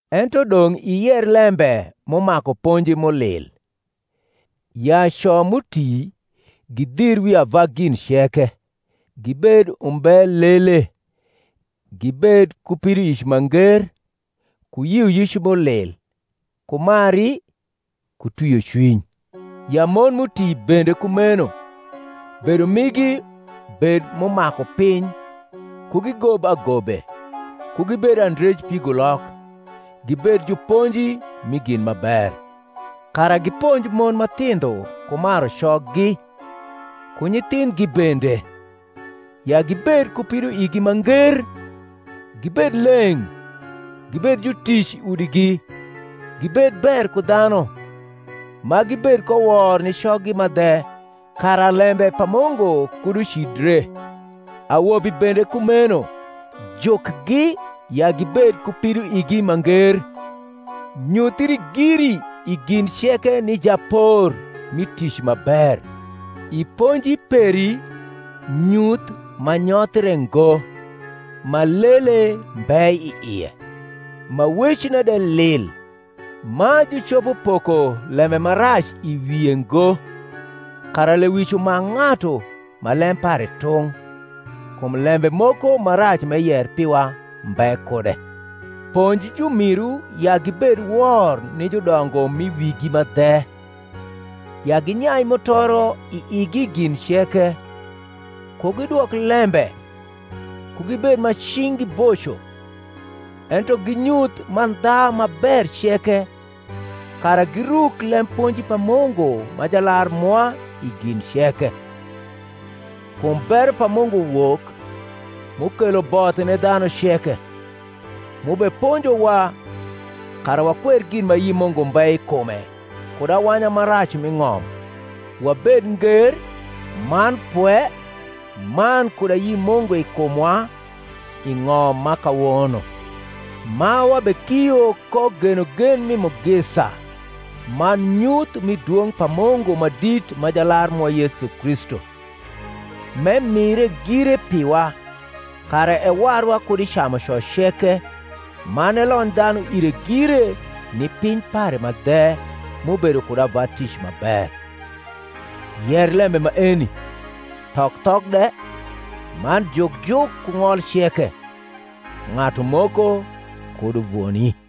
Ento dong’ iyer lembe m’umaku ponji m’ulil: ya co m’uti gidhir wi ava gin ceke, gibed unibe lele, gibed ku pidoic ma nger, ku yioyic m’ulil, ku mari, ku twiocwiny: ya mon m’uti bende kumeno bedo migi bed m’umaku piny, ku gigob agobe, ku gibed andrej pigulok, gibed juponji mi gin ma ber; kara giponj mon ma thindho ku maru coggi, ku nyithindhgi bende, ya gibed ku pidoigi ma nger, gibed leng’, gibed jutic i udigi, gibed ber ku dhanu, ma gibed ko wor ni coggi ma dhe, kara lembe pa Mungu kud ucidre; awobi bende kumeno jukgi ya gibed ku pidoigi ma nger; nyuthri giri i gin ceke ni japor mi tic ma ber, i ponji peri nyuth ma nyothre ngo, ma lele mbe i ie, ma wecne de lil, ma jucopo poko lembe ma rac i wie ngo; kara lewic umak ng’atu ma lem pare tung’, kum lembe moko ma rac m’eyer piwa mbe kude. Ponj jumiru ya gibed wor ni judongo m’i wigi ma dhe, ya ginyai mutoro i igi i gin ceke; ku gidwok lembe; ku gibed ma cing’gi boco, ento ginyuth mandha ma ber ceke; kara giruk lemponji pa Mungu ma Jalar mwa i gin ceke. Kum bero pa Mungu wok, m’ukelo both ni dhanu ceke, m’ubeponjowa, kara wakwer gin ma ayi Mungu mbe i kume kud awanya ma rac m’i ng’om, wabed nger man pwe man kud ayi Mungu i kumwa i ng’om ma kawono; ma wabekio ko genogen mi mugisa man nyuth mi dwong’ pa Mungu ma dit ma Jalar mwa Yesu Kristu; m’emire gire piwa, kara ewarwa kud i camuco ceke, man elony dhanu ire gire ni piny pare ma dhe, m’ubedo kud ava tic ma ber. Yer lembe maeni, thok thok de, man juk juk ku ng’ol ceke. Ng’atu moko kud uvoni.